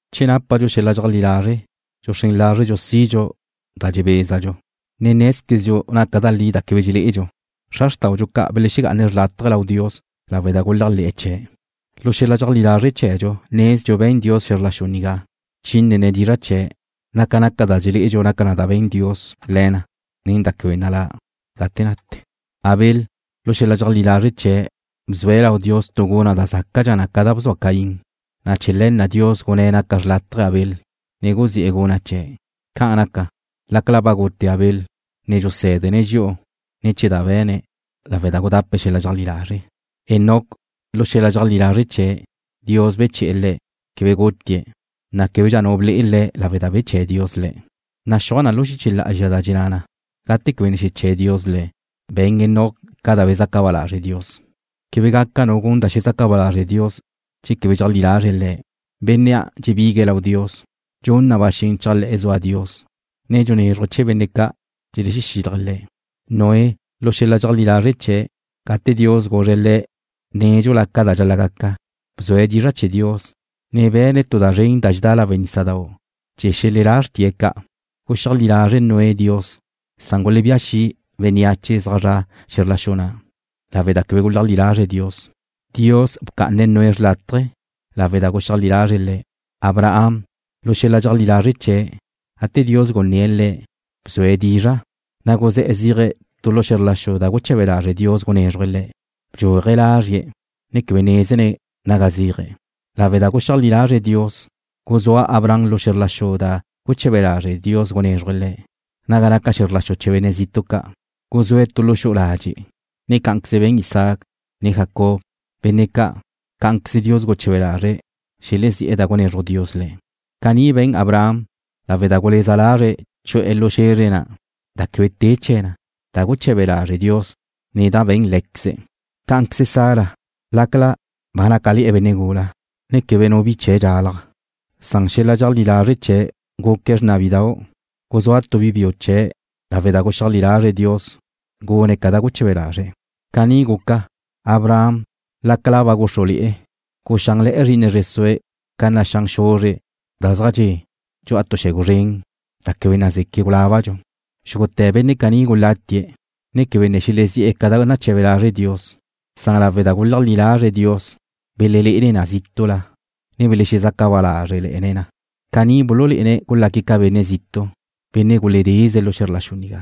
Che nápadxu xel-la' dxeajlí lazre' dxuxrén lazrdxu sidxu da dxebézadxu, ne nézquezdxu naca da li da quebe dxelé'edxu. Xra xrtáudxu ca' belexegá'ane̱' xrlátaje lau Dios lawe' da guléajle̱'e̱ chee̱'. Lu xel-la' dxeajlí lazre' chee̱dxu nezdxu be̱n Dios xe̱zr la xu nigá, bchínene̱' dizra' chee̱', na' ca naca da dxelé'edxu na'a be̱n Dios le̱ na nen da quebe nalá' gate nate. Abel, lu xel-la' dxeajlí lazre' chee̱', bzue̱' lau Dios tu guna' da zácadxa na ca da bzua Caín, na' chee̱ le̱ na' Dios gunné̱' naca xlátaje̱ Abel, ne guzi'e̱ guna' chee̱'. Ca'an naca, lácala ba gute Abel, ne dxusé̱dene̱' dxi'u ne̱ chee̱ da be̱ne̱' lawe' da gudape̱' xel-la' dxeajlí lazre'. Enoc, lu xel-la' dxeajlí lazre' chee̱', Dios beche̱'e̱ le̱'. Quebe gutie̱', na' québedxa nu ble'e le̱' lawe' da beché̱ Dios le̱'. Naxúaj na lu xiche lá'azxa da dxenná na, gate quebe ne xeché̱ Dios le̱', be̱n Enoc ca da bezaca ba lazre' Dios. Quebe gaca nu gun da xezaca ba lazre' Dios che quebe dxeajlí lazre̱' Le̱'. Bénnea' dxebigue̱' lau Dios, dxun na ba xen chéajle̱'e̱ zua Dios, ne xunézruje̱' chee̱ benne' ca' dxelexílaje̱' Le̱'. Noé, lu xel-la' dxeajlí lazre' chee̱', gate Dios guzre̱' le̱' nédxula ca da dxal-la' gaca, bzue̱' dizra' chee̱ Dios, ne be̱ne̱' tu da zren da dxedá lawe' nísadau' chee̱ xelelá xrtie̱' ca'. Guxeajlí lazre' Noé Dios, san gulebía xi' bénneache zaj zre̱'e̱ xe̱zr la xu na', lawe' da quebe guleajlí lazre̱' Dios. Dios bca'ane̱' Noé xrlátaje lawe' da guxeajlí lazre̱' Le̱'. Abraham, lu xel-la' dxeajlí lazre' chee̱', gate Dios gunné̱' le̱', bzue̱' dizra', ne guzé̱'e̱ zéaje̱' tu lu xe̱zr la xu da guchebe lazre' Dios gunézruje̱' chee̱'. Bdxuaje̱' lázrie̱', ne quebe nézene̱' naga zéaje̱'. Lawe' da guxeajlí lazre̱' Dios, guzúa Abraham lu xe̱zr la xu na' da guche̱be lazre' Dios gunézruje̱' chee̱', naga naca xe̱zr la xu chee̱ benne' zitu' ca'. Guzúe̱' tu lu xu'u ladxe', ne cá'anqueze be̱n Isaac, ne Jacob, benne' ca', cá'anqueze Dios guche̱be lazre̱' xelezí'e̱ da na' gunezruj Dios le̱'. Caní be̱n Abraham lawe' da guleza lazre̱' chu'e̱ lu xe̱zre na' da quebe te chee̱ na, da na' guleche Dios, ne da be̱n Lé̱queze̱'. Cá'anqueze Sara, lácala ba nácale̱'e̱ benne' gula, ne quebe nu bi chee̱' dxalaj, san xel-la' dxeajlí lazre' chee̱' guque̱' xrna bidau'. Guzúa tu bi biu chee̱' lawe' da guxeajlí lazre̱' Dios gune̱' ca da guche̱be lazre̱'. Caní guca, Abraham, lácala ba gúxrule̱'e̱, guxánle̱'e̱ zri'ine zre sue̱' ca naxán xuzre' da zaj dxe' dxu'a tu yegu zren, da quebe nazeque' gulábadxu. Xúgute̱ benne' caní gulatie̱', ne quebe ne xelezí'e̱ da ca' nache̱be lazre' Dios, san lawe' da guleajlí lazre̱' Dios, belelé'ene̱' na zítu'la, na' belexezaca ba lázrele̱ne̱' na. Caní bululé'ene̱' gulaque̱' ca benne' zitu', benne' guledeze lu xe̱zr la xu nigá.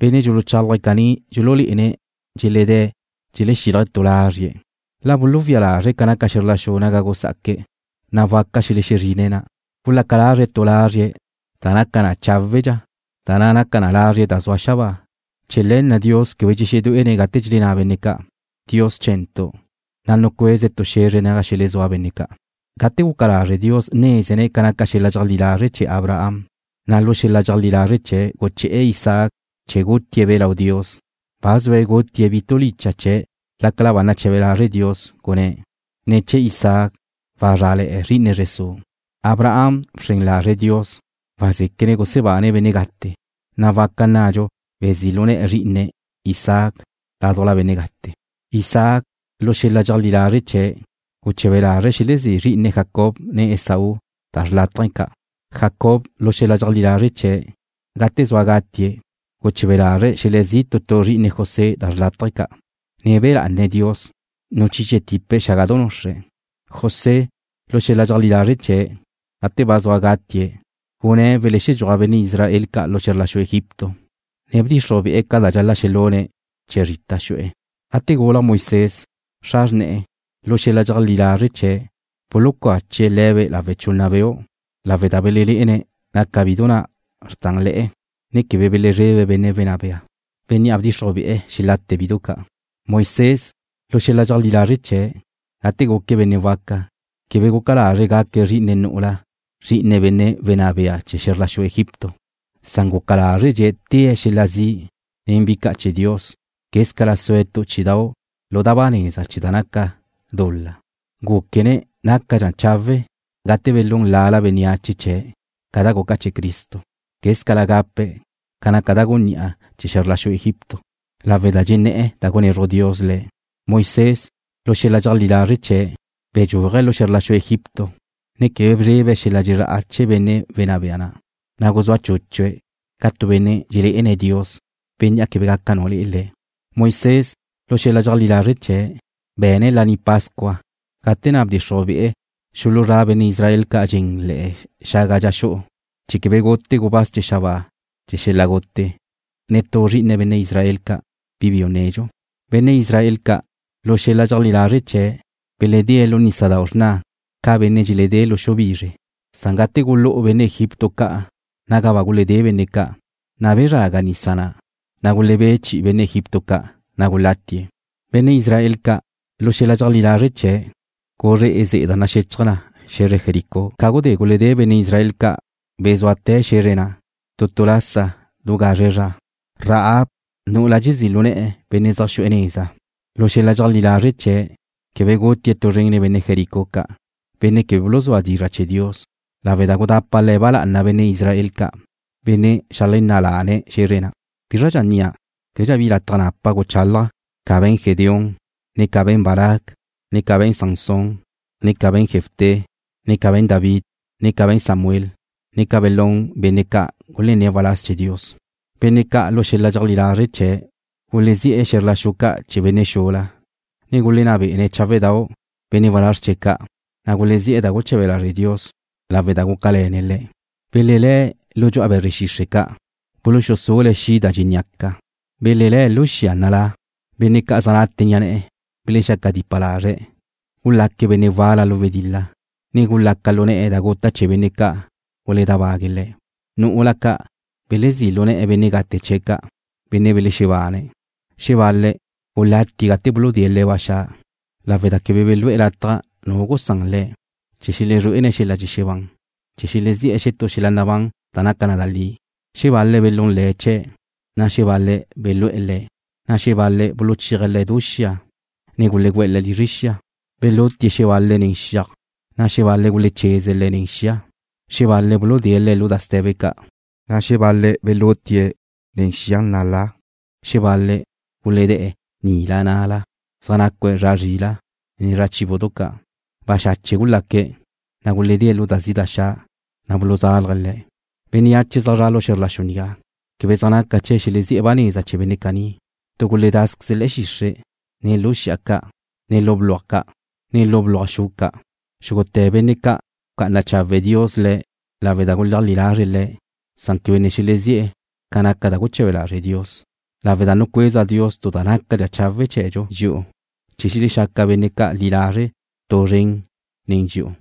Benne' dxuluchálaje̱' caní dxululé'ene̱' dxeledé̱' dxelexílaje̱' tu lazrie̱'. La buluwía lazre̱' ca naca xe̱zr la xu naga gusá'aque̱', na' waca xelexezrine̱' na'. Gulaca lazre̱' tu lazrie̱' da naca na cháwe'dxa, da na' naca na lazrie̱' da zua xabáa. Chee̱ le̱ na' Dios quebe dxexedué'ene̱' gate dxelenná benne' ca' naque̱' Dios chee̱', na' nucueze̱' tu xe̱zre naga xelezúa benne' ca'. Gate guca lazre' Dios nézene̱' ca naca xel-la' dxeajlí lazre' chee̱ Abraham, na' lu xel-la' dxeajlí lazre' chee̱' guché̱'e̱ Isaac chee̱ gutie̱'-be' lau Dios. Ba zue̱' gutie̱' bi tu licha' chee̱' lácala ba nache̱be lazre' Dios, gunné̱': “Ne̱ chee̱ Isaac wazrále̱'e̱ zri'ine zre su'.” Abraham bxren lazre̱' Dios wazéquene̱' gusebane̱' benne' gate, na' waca nnadxu bezí' lu ne̱'e̱ zrí'ine̱' Isaac ládujla benne' gate. Isaac, lu xel-la' dxeajlí lazre' chee̱', guche̱be lazre̱' xelezí' zrí'ine̱' Jacob, ne Esaú da xrlátaje ca'. Jacob, lu xel-la' dxeajlí lazre' chee̱', gate zua gatie̱', guche̱be lazre̱' xelezí' tu tu zri'ine José da xrlátaje ca', ne be̱ lá'ane̱' Dios, nuchiche tipe̱' xágadu nuxre̱'. José, lu xel-la' dxeajlí lazre' chee̱', gate ba zua gatie̱' gunné̱' welexedxúaj benne' Israel ca' lu xe̱zr la xu Egipto, ne bdxixruj be'e̱ ca dxal-la' xelune̱' chee̱ zrita xu'e̱. Gate gulaj Moisés, xra xrne̱'e̱, lu xel-la' dxeleajlí lazre' chee̱' bulucache̱' le̱be' lawe' chunna beu', lawe' da belelé'ene̱' naca bidu na' xrtanle̱'e̱, ne quebe belezrebe̱' benne' wenná bea, bénnea' bdxixruj be'e̱ xelate bidu ca'. Moisés, lu xel-la' dxeajlí lazre' chee̱', gate guque̱' benne' waca, quebe guca lazre̱' gaque̱' zri'ine nu'ula zri'ine benne' wenná bea chee̱ xe̱zr la xu Egipto, san guca lázredxe̱' tée̱' xel-la' zi' nen bi ca' chee̱ Dios quézcala sue̱' tu chí'idau' lu da ba neza chee̱ da naca dul-la. Gúquene̱' nácadxa chawe' gate belún lala bénneache chee̱' ca da guca chee̱ Cristo, quézcala gape̱' ca naca da gunní'a chee̱ xe̱zr la xu Egipto, lawe' da dxenné̱'e̱ da gunezruj Dios le̱'. Moisés, lu xel-la' dxeajlí lazre' chee̱', bedxúaje̱' lu xe̱zr la xu Egipto, ne quebe bezrebe̱' xel-la' dxezrá'a chee̱ benne' wenná bea, na' guzúa chúchue̱' ca tu benne' dxelé'ene̱' Dios, Bénnea' quebe gaca nu le'e. Moisés, lu xel-la' dxeajlí lazre' chee̱', be̱ne̱' Laní Pascua gate na' bdxixruj be'e̱ xuluzrá benne' Israel ca' dxen le̱'e̱ xaga dxa xu'u chee̱ quebe gute gubáz chee̱ xabáa chee̱ xel-la' gute netú zri'ine benne' Israel ca', bi biu nedxu. Benne' Israel ca', lu xel-la' dxeleajlí lazre' chee̱', beledée̱' lu Nísadau' Xrna ca benne' dxeledé lu xu bizre, san gate gulú'u benne' Egipto ca' naga ba guledé benne' ca', na' bezraga nisa na', na' gulebé' chi'i benne' Egipto ca', na' gulatie̱'. Benne' Israel ca', lu xel-la' dxeleajlí lazre' chee̱', guzré'e ze'e da naxechaj na xe̱zre Jericó ca gudé guledé benne' Israel ca' bezúate̱ xe̱zre na' tu tu lasa du gazre zra. Rahab, nu'ula dxezí' lu ne̱'e̱ benne' zaj xu'e̱ neza, lu xel-la' dxeajlí lazre' chee̱', quebe gutie̱' tu zren nen benne' Jericó ca', benne' quebe buluzúa dizra' chee̱ Dios, lawe' da gudapa le̱' ba lá'ana benne' Israel ca', benne' xeajlenná' lane̱' xe̱zre na'. ¿Bízradxa nnia'? Québedxa bi lataj napa' guchálaja' ca be̱n Gedeón, ne ca be̱n Barac, ne ca be̱n Sansón, ne ca be̱n Jefté, ne ca be̱n David, ne ca be̱n Samuel, ne ca belún benne' ca' gulenné̱' waláz chee̱ Dios. Benne' ca' lu xel-la' dxeleajlí lazre' chee̱' gulezí'e̱ xe̱zr la xu ca' chee̱ benne' xula, ne gulenná be'ene̱' cháwe'dau' benne' walázr chee̱' ca', na' gulezí'e̱ da guche̱be lazre' Dios, lawe' da gúcale̱ne̱' le̱'. Belelé̱' lu dxu'a be̱zre xixre' ca'. Buluxusule̱' xi' da dxéneaca. Belelé̱' lu xia nalá. Benne' ca' zaj nate ni'a na' belexaque̱' dipa lazre'. Gulaque̱' benne' wala lu wedil-la, ne gulaca lu ne̱'e da guta' chee̱ benne' ca' guledábague̱' le̱'. Nu'ula ca' belezí' lu ne̱'e̱ benne' gate chee̱' ca', benne' belexebáne̱'. Xebal-le̱' gulátie̱' gate buludée̱' le̱' ba xa', lawe' da quebe belú'e̱ lataj nu gusán le̱', chee̱ xelezrué'ene̱' xel-la' dxexebán chee̱ xelezi'e̱ xetú xel-la' nabán da naca na da li. Xebal-le̱' belún le̱' chee̱', na' xebal-le̱' belú'e̱ le̱', na' xebal-le̱' buluchéaje̱' le̱' du xia ne gulegu'e̱ le̱' lizre xia. Belutie̱' xebal-le̱' nen xiaj, na' xebal-le̱' gulecheze̱' le̱' nen xia. Xebal-le̱' buludée̱' le̱' lu da ste̱be ca', na' xebal-le̱' belutie̱' nen xia nalá. Xebal-le̱' guledée̱' nila na'la, zaj nacue̱' zra zrila' ne zra béadu ca'. Baxache' gulaque̱', na' guledée̱' lu da zi' da xa', na' buluzalje̱' le̱'. Bénneache zaj zra' lu xe̱zr la xu nigá quebe zaj naca chee̱' xelezí'e̱ ba neza chee̱ benne' caní. Tu guledázqueze̱' le̱'e̱ xixre', ne lu xi'a ca', ne lu bluaj ca', ne lu bluaj xu ca'. Xúgute̱ benne' ca' bca'ana chawe' Dios le̱' lawe' da guleajlí lazre̱' Le̱', san quebe ne xelezí'e̱ ca naca da guche̱be lazre' Dios, lawe' da nucueza Dios tu da nácadxa chawe' chee̱dxu dxi'u, chee̱ xelexaca benne' ca' li lazre' tu zren nen dxi'u.